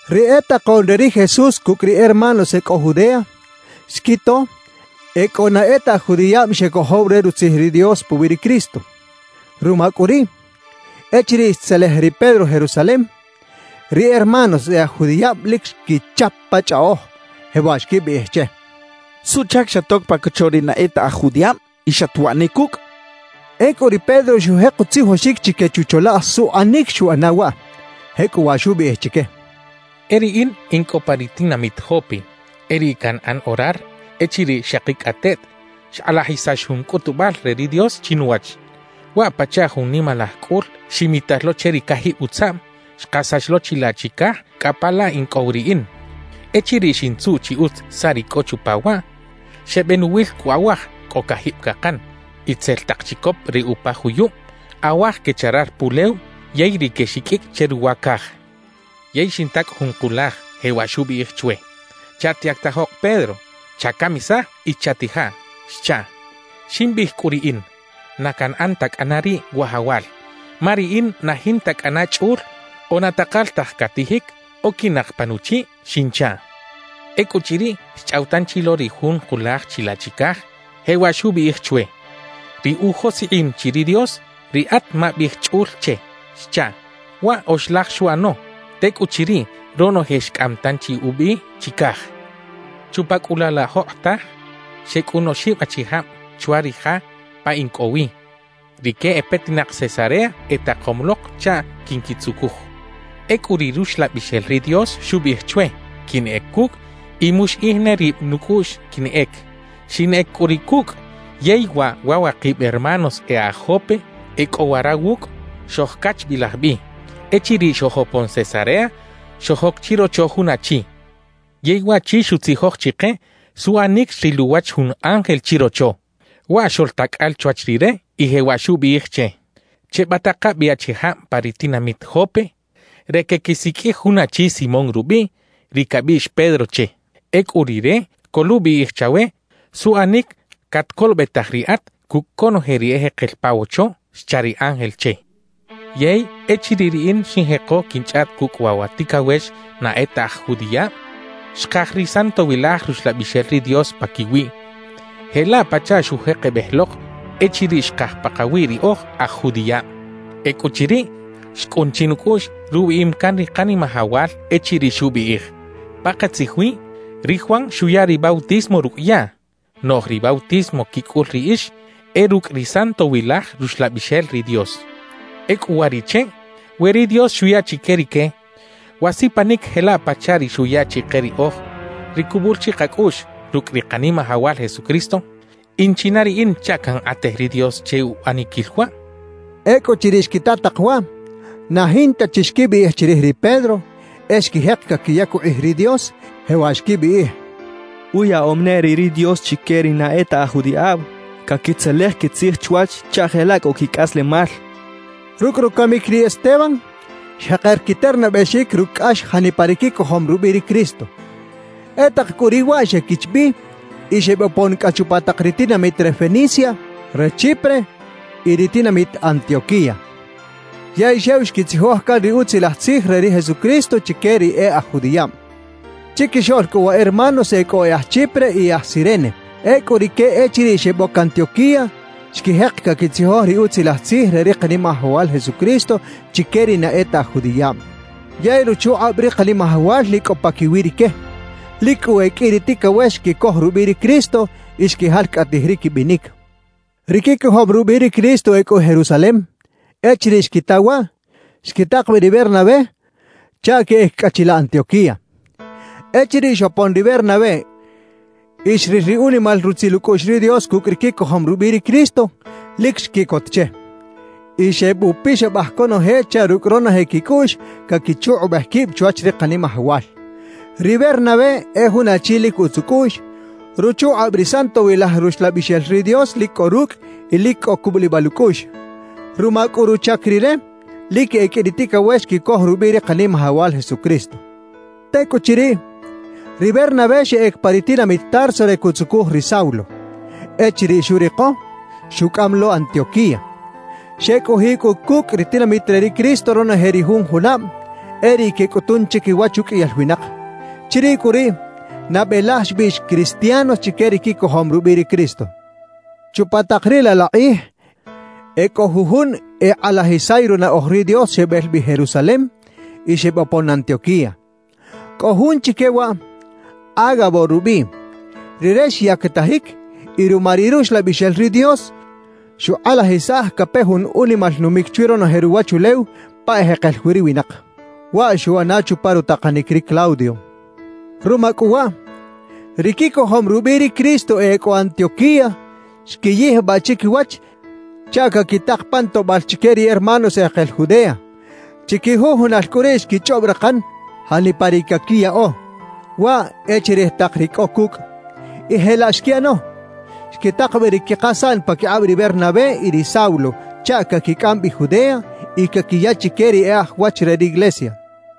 Ri e takoꞌn re ri Jesús cucꞌ ri hermanos e cꞌo Judea xquito e cꞌo na e ta aj judiꞌab xecojow re Rutzij ri Dios puwi ri Cristo. Ruma cꞌu riꞌ, echiriꞌ xtzelej ri Pedro Jerusalem, ri hermanos e aj judiꞌab lic xquichap pa chꞌaꞌoj, jewaꞌ xquibiꞌij che: «¿Suꞌchac xatoc pa cocho ri na e ta aj judiꞌab y xatwaꞌ ne cucꞌ?» xechaꞌ. Ecꞌu ri Pedro xujek utzijoxic chique chucholaꞌj suꞌanic xuꞌana waꞌ. Jecꞌuwaꞌ xubiꞌij chique: «E riꞌin in cꞌo pa ri tinamit Jope e riꞌ canꞌan orar echiriꞌ xakicꞌateꞌt xkꞌalajisax jun cꞌutubal re ri Dios chinuwach. Waꞌ pachaꞌ jun nimalaj cꞌul ximital lo che ri cajib utzaꞌm, xkasax lo chilaꞌ chicaj cꞌa pa la in cꞌo wi riꞌin. Echiriꞌ xintzuꞌ chi utz saꞌ ri cꞌo chupa waꞌ, xebenuwil cꞌu awaj cꞌo cajib cakan, itzel tak chicop re upa juyub, awaj quecharar pulew, yey ri quexiqꞌuicꞌ che ruwa caj. »Yey xinta cꞌu jun kulaj, jewaꞌ xubiꞌij chwe: “Chatyactajok Pedro; chacamisaj y chatijaꞌ” xchaꞌ. »Ximbiꞌij cꞌu riꞌin: “Na canꞌan ta cꞌana riꞌ, Wajawal, ma riꞌin na jinta cꞌana chꞌul o na takal taj catijic oquinak pa nuchiꞌ” xinchaꞌ. »Ecꞌuchiriꞌ, xchꞌaw tanchi lo ri jun kulaj chilaꞌ chicaj, jewaꞌ xubiꞌij chwe: “Ri ujoskꞌim chi ri Dios, riꞌat mabiꞌij chꞌul che” xchaꞌ. »Waꞌ oxlaj xuꞌano. Tecꞌuchiriꞌ, ronoje xcꞌam tanchi ubi chicaj. »Chupa cꞌu laꞌ la jokꞌotaj xecꞌun oxib achijab chwa ri ja pa in cꞌo wi; rique e petinak Cesarea, etakom lok chaꞌ quinquitzucuj. Ecꞌu ri Ruxlabixel ri Dios xubiꞌij chwe quinꞌec cucꞌ y muxiꞌij ne rib nucꞌuꞌx quinꞌec. Xinꞌec cꞌu riꞌ cucꞌ; yey waꞌ wa wakib hermanos e aj Jope e cꞌo wara wucꞌ, xojcachbilaj bi. »Echiriꞌ xojopon Cesarea, xojoc chirocho jun achi. Yey waꞌchi xutzijoj chike suꞌanic xril uwach jun ángel chirocho. Waꞌ xoꞌltacꞌal chwach rire y jewaꞌ xubiꞌij che: “Chebataka bi achijab pa ri tinamit Jope re queꞌquisiqꞌuij jun achi Simón rubiꞌ, ri cabiꞌx Pedro che. Ecꞌu rire coluꞌbiꞌij chawe suꞌanic catcolobetaj riꞌat cucꞌ conoje ri ejekel pa wocho” xcha ri ángel che. »Yey, echiriꞌ riꞌin xinjeko quinchꞌaꞌt cucꞌ waꞌ wa ticawex na e ta aj judiꞌab, xkaj ri Santowilaj Ruxlabixel ri Dios paquiwiꞌ jelaꞌ pachaꞌ xujekebej lok echiriꞌ xkaj pakawi ri oj aj judiꞌab. »Ecꞌuchiriꞌ, xcꞌun chinucꞌuꞌx rubiꞌim can ri Kanimajawal echiriꞌ xubiꞌij: “Pakatzij wi, ri Juan xuya ri bautismo rucꞌ yaꞌ, noꞌj ri bautismo quicꞌul riꞌix e rucꞌ ri Santowilaj Ruxlabixel ri Dios.” »Ecꞌu uwariꞌche, we ri Dios xuya chique rique wa sipanic jelaꞌ pachaꞌ ri xuya chike riꞌoj ri cubul chi kacꞌuꞌx rucꞌ ri Kanimajawal Jesucristo, ¿in china riꞌin chaꞌ cankꞌatej ri Dios che uꞌaniquil waꞌ?» xcha ri Pedro. Ecꞌuchiriꞌ xquita tak waꞌ, na jinta chi xquibiꞌij chirij ri Pedro, e xquijek caquiyac ukꞌij ri Dios, jewaꞌ xquibiꞌij: «¡Uyaꞌom ne riꞌ ri Dios chique ri na e ta aj judiꞌab caquitzelej quitzij chwach chaꞌ jelaꞌ cꞌo quicꞌaslemal!» xechaꞌ. Rucꞌ rucamic ri Esteban, xjeker quiternabexic rucꞌ cꞌax janipa ri quicojom rubiꞌ ri Cristo. E tak cꞌu riꞌ waꞌ xequich bi y xebopon cꞌa chupa tak ri tinamit re Fenicia, re Chipre y ri tinamit Antioquía. Yey xew xquitzijoj can ri Utzilaj Tzij re ri Jesucristo chique ri e aj judiꞌab. Chiquixoꞌl cꞌu wa hermanos e cꞌo e aj Chipre y e aj Cirene. Ecꞌu rique echiriꞌ xeboc Antioquía, xquijek caquitzijoj ri Utzilaj Tzij re ri Kanimajawal Jesucristo chique ri na e ta aj judiꞌab. Yey ruchukꞌab ri Kanimajawal lic cꞌo paquiwi rique. Lic cꞌu e qꞌui ri ticawex xquicoj rubiꞌ ri Cristo y xquijalcꞌatij ri quibinic. Ri quicojom rubiꞌ ri Cristo e cꞌo Jerusalem, echiriꞌ xquita waꞌ, xquitak bi ri Bernabé chaꞌ queꞌec cꞌa chilaꞌ Antioquía. Echiriꞌ xopon ri Bernabé y xril ri unimal rutzil ucꞌuꞌx ri Dios cucꞌ ri quicojom rubiꞌ ri Cristo, lic xquiꞌcot che. Y xebupixabaj conoje chaꞌ rucꞌ ronoje quicꞌuꞌx caquichukꞌubej quib chwach ri Kanimajawal. Ri Bernabé e jun achi lic utz ucꞌuꞌx, ruchukꞌab ri Santowilaj Ruxlabixel ri Dios lic cꞌo rucꞌ y lic cꞌo cubulibal ucꞌuꞌx. Ruma cꞌu ruchac rire, lic e qꞌui ri ticawex xquicoj rubiꞌ ri Kanimajawal Jesucristo. Tecꞌuchiriꞌ, ri Bernabé xeꞌec pa ri tinamit Tarso re cuꞌtzucuj ri Saulo. Echiriꞌ xuriko, xucꞌam lo Antioquía. Xecꞌojiꞌ cꞌu cucꞌ ri tinamit re ri Cristo ronoje ri jun junab, e riꞌ quecꞌutun chiquiwach uqꞌuiyal winak. Chiriꞌ cꞌu riꞌ, nabe laj xbiꞌx “cristianos” chique ri quicojom rubiꞌ ri Cristo. Chupa tak riꞌ laꞌ la kꞌij e cꞌo jujun ekꞌalajisay runaꞌoj ri Dios xebel bi Jerusalem y xebopon Antioquía. Cꞌo jun chique waꞌ, Ágabo rubiꞌ. Rire xyactajic y ruma ri Ruxlabixel ri Dios, xukꞌalajisaj cape jun unimal numic chwi ronoje ruwachulew pa ejekel wi ri winak. (Waꞌ xuꞌana chupa rutakanic ri Claudio.) Ruma cꞌu waꞌ, ri quicojom rubiꞌ ri Cristo e cꞌo Antioquía xquiyijbaꞌ chiquiwach chaꞌ caquitak pan toꞌbal chique ri hermanos ejekel Judea; chiquijujunal cꞌu riꞌ xquichꞌob rakan janipa ri caquiyaꞌo, waꞌ e chirij tak ri cꞌo cucꞌ. Y jelaꞌ xquiꞌano; xquitak bi ri quikasaꞌn paquikꞌab ri Bernabé y ri Saulo chaꞌ caquicꞌam bi Judea y caquiya chique ri e aj wach re riglesia.